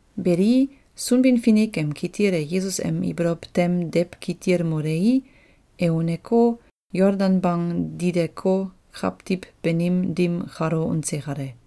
Beli, Sunbin-Finik em kitil e Yesus em ibolow tem dewkitil molei, e uneko, Yoldan bang dikeko, kawtiw banim dim kalo unse kale.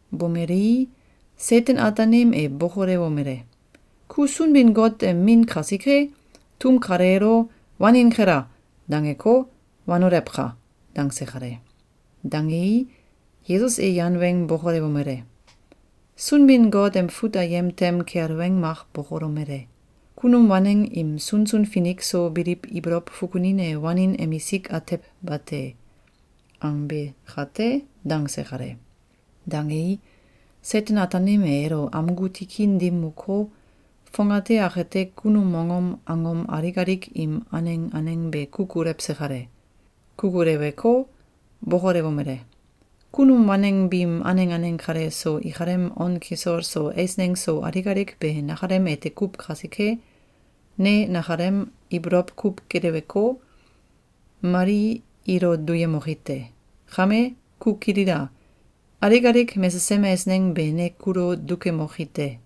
Bomelei, Seten-Ataanim e bokolewomele: “Ku Sunbin-Got em Min kasike, tum kaleelo ‘Wanin kela!’, dangeko, wanolewka!”, dangse kale. Dangei, Yesus e yan weng bokolewomele: “Sunbin-Got em fut ayem tem kel weng mak bokolomele: ‘Kunum waneng im sunsun finik so biliw ibolow fukunin e wanin emisik atew bate!’, angbe kate.”, dangse kale. Dangei, Seten-Ataanim e elo amgu tikin dim moko, fongate akate kunum mongom angom alik alik im aneng aneng be kukulewse kale. Kukuleweko, bokolewomele: “Kunum waneng biim aneng aneng kale so ikalem on kisol so eisneng so alik alik be nakalem ete kuw kasike, ne nakalem ibolow kuw geleweko, mali ilo duyemoki te. Kame, ku kilila! Alik alik mesesem eisneng be ne kulo dukemoki te.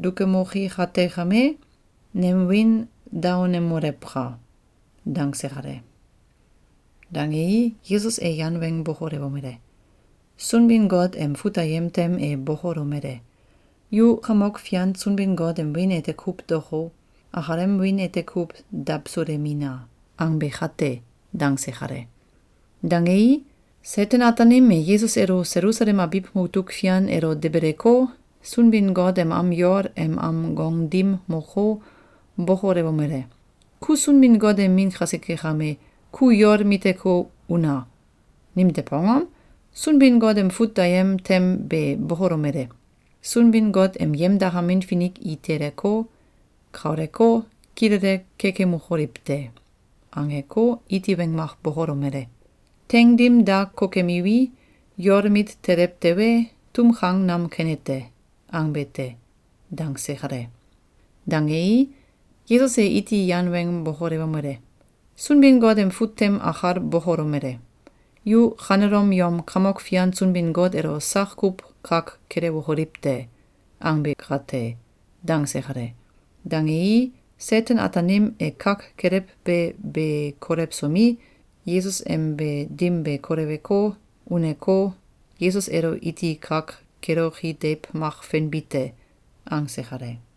Dukemoki kate kame, nem wiin daonemoleka!”, dangse kale. Dangei, Yesus e yan weng bokolewomele: “Sunbin-Got em fut ayem tem e bokolomele: ‘Yu Kamok Fian Sunbin-Got em wiin ete kuw daoko, akalem wiin ete kuw dawsulemina!’, angbe kate.”, dangse kale. Dangei, Seten-Ataanim e Yesus elo Selusalem abiw mutuk fian elo debeleko, Sunbin-Got em am yol em am gong dim moko, bokolewomele: “Ku Sunbin-Got em Min kasike kame, ku yol miteko, una! Nimtew angom? Sunbin-Got em fut ayem tem be bokolomele: ‘Sunbin-Got em yemdakamin finik i teleko, kauleko, kilele kekemokoliw te.’, angeko, iti weng mak bokolomele: ‘Teing dim da kokemiwi, yol mit telew tewe, tum kang nam kene te.’, angbe te.”, dangse kale. Dangei, Yesus e iti yan weng bokolewomele: “Sunbin-Got em fut tem akal bokolomele: ‘Yu kanelom yom Kamok fian Sunbin-Got elo sak kuw kak kelewokoliw te!’, angbe kate!”, dangse kale. Dangei, Seten-Ataanim e kak kelewbe be kolewsomi, Yesus em be dim be koleweko, uneko, “Yesus elo iti kak keloki deiw mak fenbi te!”, angse kale.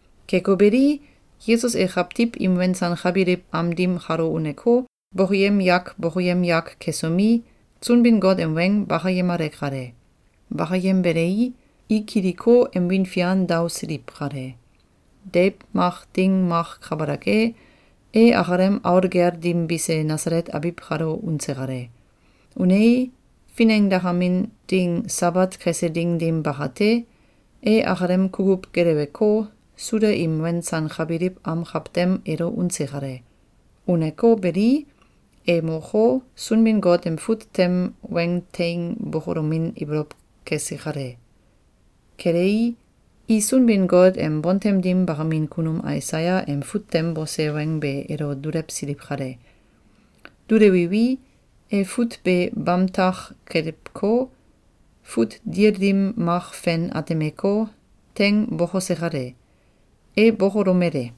Keko beli, Yesus e kawtiw im wensankakbiliw am dim kalo uneko, bokoyem yak bokoyem yak kesomi, Sunbin-Got em weng bakayemale kale. Bakayembelei, i kiliko, em wiin fian daosiliw kale. Deiw mak ding mak kabalak e, e akalem aul gel dim bise Nasalet abiw kalo unse kale. Unei, finengdakamin ding Sabat kese ding dim bakate, e akalem kukuw geleweko, Suda im wensankabiliw am kawtem elo unse kale. Uneko beli, e moko, Sunbin-Got em fut tem weng teing bokolomin ibolow kese kale. Kelei, i Sunbin-Got em bontem dim bakamin kunum Aisaya em fut tem bose weng be elo dulewsiliw kale. Dulewiwi, e fut be bamtak kelewko, fut dil dim mak fen atemeko, teing bokose kale. E bokolomele: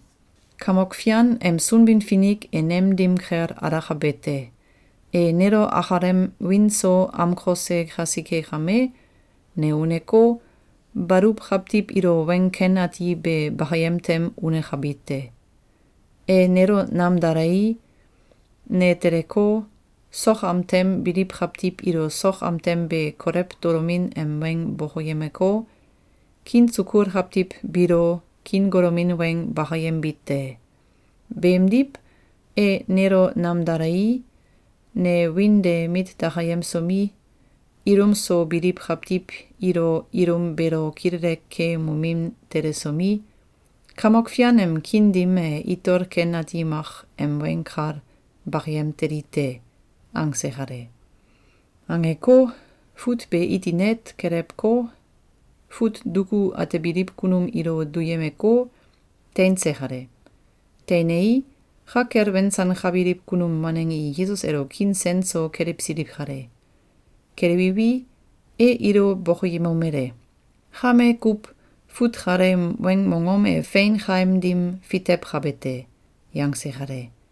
“Kamok Fian em Sunbin-Finik e nem dim kel alakabe te. E nelo akalem wiin so amkose kasike kame, ne uneko, baluw kawtiw ilo weng ken ati be bakayem tem unekabi te. E nelo namdalei, ne teleko, sok am tem biliw kawtiw ilo sok am tem be kolew tolomin em weng bokoyemeko, kiin sukul kawtiw biilo kiin golomin weng bakayembi te. Beemdiw, e nelo namdalei, ne wiin de mit dakayemsomi, ilum so biliw kawtiw ilo ilum beelo kilele keemomin telesomi, Kamok Fian em kiin dim e itol ken ati mak em weng kal bakayem teli te.”, angse kale. Angeko, fut be iti net kelewko, fut duku atebiliw kunum ilo duyemeko, teinse kale. Teinei, ka kel wensankabiliw kunum waneng i Yesus elo kiin sen so kelewsiliw kale. Kelewiwi, e ilo bokoyemomele: “Kame kuw, fut kaleem weng mongom e fein kaim dim fitewkabe te.”, yangse kale.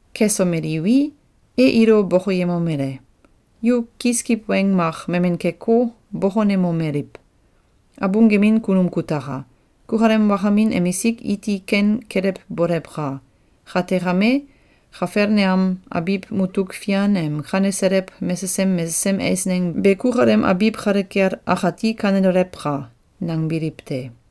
Kesomeliwi, e ilo bokoyemomele: “Yu kiskiw weng mak memen keko, bokonemomeliw: ‘Abung gemin kunum kutaka! Kukalem wakamin emisik iti ken kelewbolewka! Kate kame, Kafelneam abiw mutuk fian em kaneselew mesesem mesesem eisneng be kukalem abiw kale kel akati kanelolewka!’, nangbiliw te.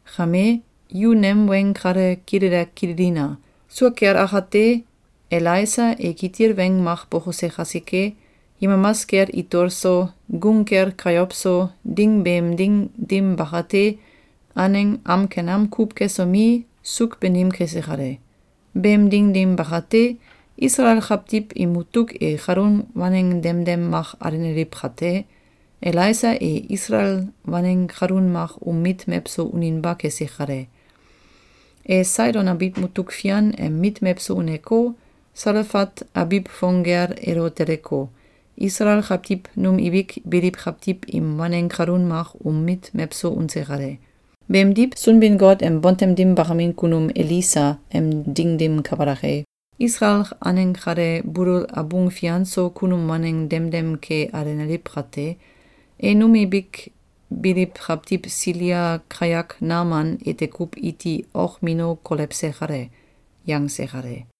Kame, yu nem weng kale kilele kililina! Sua kel akate, Elaisa e kitil weng mak bokose kasike, yemamas kel itol so, gung kel kayow so, ding beem ding dim bakate, aneng am ken am kuw kesomi, suuk banim kese kale. Beem ding dim bakate, Isalael kawtiw im mutuk e kalun waneng demdem mak alenaliw kate, Elaisa e Isalael waneng kalun mak um mit mewso uninba kese kale. E Saidon abiw mutuk fian em mit mewso uneko, Salefat abiw fong gel elo teleko, Isalael kawtiw num ibik biliw kawtiw im waneng kalun mak um mit mewso unse kale. Beemdiw, Sunbin-Got em bontem dim bakamin kunum Elisa em ding dim kabalak e, Isalael aneng kale bulul abung fian so kunum waneng demdem ke alenaliw kate, e num ibik biliw kawtiw Silia kayak Naman ete kuw iti okmino kolewse kale.”, yangse kale.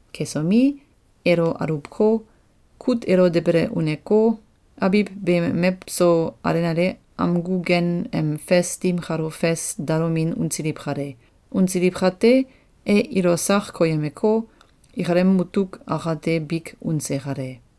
Kesomi, elo aluwko, kut elo debele uneko, abiw beem mewso alenale amgu gen em fes dim kalo fes dalomin unsiliw kale. Unsiliw kate, e ilo sak koyemeko, ikalem mutuk akate bik unse kale.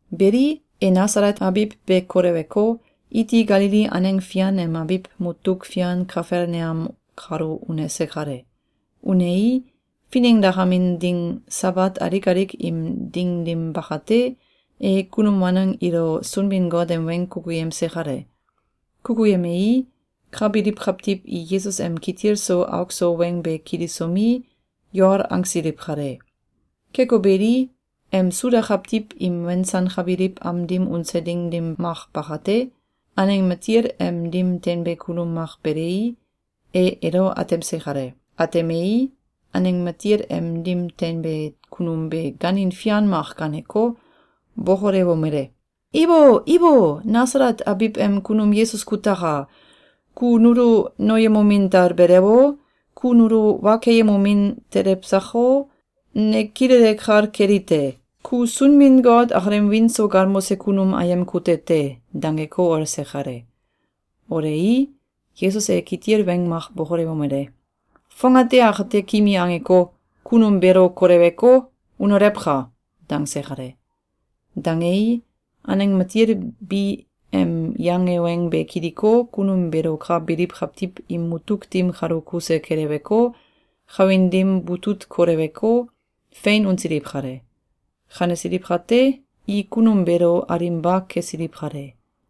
Beli, e Nasalet abiw be koleweko, iti Galili aneng fian em abiw mutuk fian Kafelneam kalo unese kale. Unei, finengdakamin ding Sabat alik alik im ding dim bakate, e kunum waneng ilo Sunbin-Got em weng kukuyemse kale. Kukuyemei, ka biliw kawtiw i Yesus em kitil so auk so weng be kilisomi, yol angsiliw kale. Keko beli, em Suda kawtiw im wensankabiliw am dim unse ding dim mak bakate, aneng matil em dim teinbe kunum mak belei, e elo atemse kale. Atemei, aneng matil em dim teinbe kunum be gaanin fian mak gaaneko, bokolewomele: “Ibo! Ibo! Nasalet abiw em kunum Yesus kutaka! Ku nulo noyemomin talbelew o? Ku nulo wa keyemomin telew sako? Ne kilele kal kelite: Ku Sunbin-Got akalem wiin so galmose kunum ayem kute te!”, dangeko olse kale. Olei, Yesus e kitil weng mak bokolewomele: “Fongate akate kimi angeko, kunum beelo koleweko, unolewka!”, dangse kale. Dangei, aneng matil bi em yange weng be kiliko, kunum beelo ka biliw kawtiw im mutuk dim kalo kuse keleweko, kawin dim butut koleweko, fein unsiliw kale. Kanesiliw kate, i kunum beelo alinba kesiliw kale.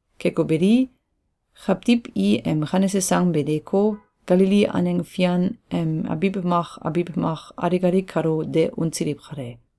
Keko beli, kawtiw i em kanese sang be deeko, Galili aneng fian em abiw mak abiw mak alik alik kalo de unsiliw kale.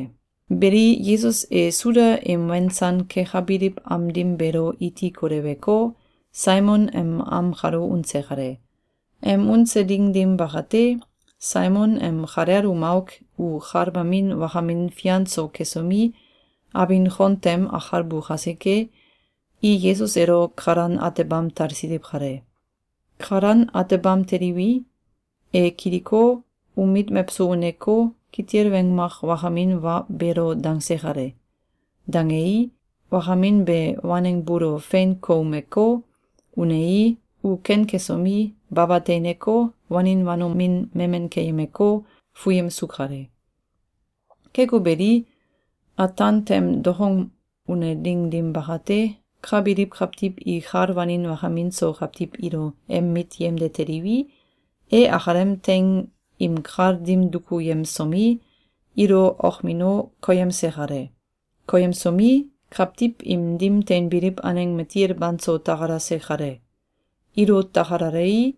Beli, Yesus e Suda im wensan kekabiliw am dim beelo iti koleweko, Saimon em am kalo unse kale. Em unse ding dim bakate, Saimon em kalel um auk u kal mamin wakamin fian so kesomi, abin kon tem akalbu kasike, i Yesus elo kalan atebam talsiliw kale. Kalan atebam teliwi, e kiliko, um mit mewso uneko, kitil weng mak wakamin wa beelo dangse kale. Dangei, wakamin be waneng buulo fein koumeko, unei, u ken kesomi, baba teineko, wanin wanomin memen keyemeko, fuyemsu kale. Keko beli, ataan tem dokong une ding dim bakate, ka biliw kawtiw i kal wanin wakamin so kawtiw ilo em mit yemde teliwi, e akalem teing im kal dim dukuyemsomi, ilo okmino koyemse kale. Koyemsomi, kawtiw im dim teinbiliw aneng matil banso takalase kale. Ilo takalalei,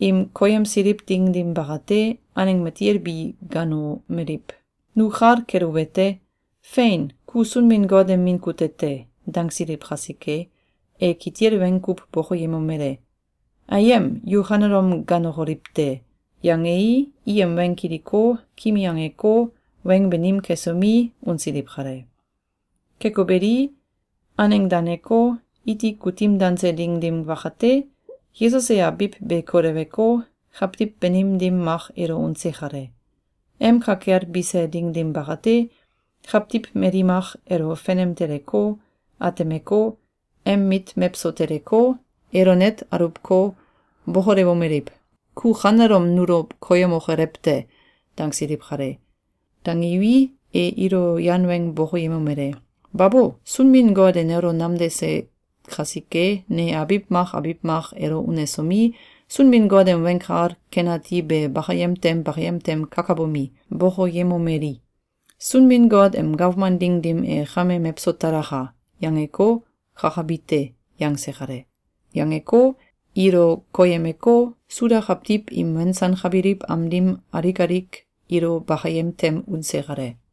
im koyemsiliw ding dim bakate, aneng matil bi gaanomeliw: “Nu kal keluwete: Fein! Ku Sunbin-Got em Min kute te!”, dangsiliw kasike, e kitil weng kuw bokoyemomele: “Ayem! Yu kanelom gaanokoliw te!”, yangei, i em weng kiliko, kimi angeko, weng banim kesomi, unsiliw kale. Keko beli, aneng daneko, iti kutim danse ding dim bakate, Yesus e abiw be koleweko, kawtiw banim dim mak elo unse kale. Em ka kel bise ding dim bakate, kawtiw mali mak elo fenem teleko, atemeko, em mit mewso teleko, elo net aluwko, bokolewomeliw: “Ku kanelom nulo koyemokolew te!”, dangsiliw kale. Dangiwi, e ilo yan weng bokoyemomele: “Babo! Sunbin-Got e nelo namdase kasike, ne abiw mak abiw mak elo unesomi, Sunbin-Got em Weng Kal Ken Ati be bakayem tem bakayem tem kakabomi, bokoyemomeli: ‘Sunbin-Got em gawman ding dim e kame mewso talaka!’, yangeko, kakabi te!”, yangse kale. Yangeko, ilo koyemeko, Suda kawtiw im wensankabiliw am dim alik alik ilo bakayem tem unse kale.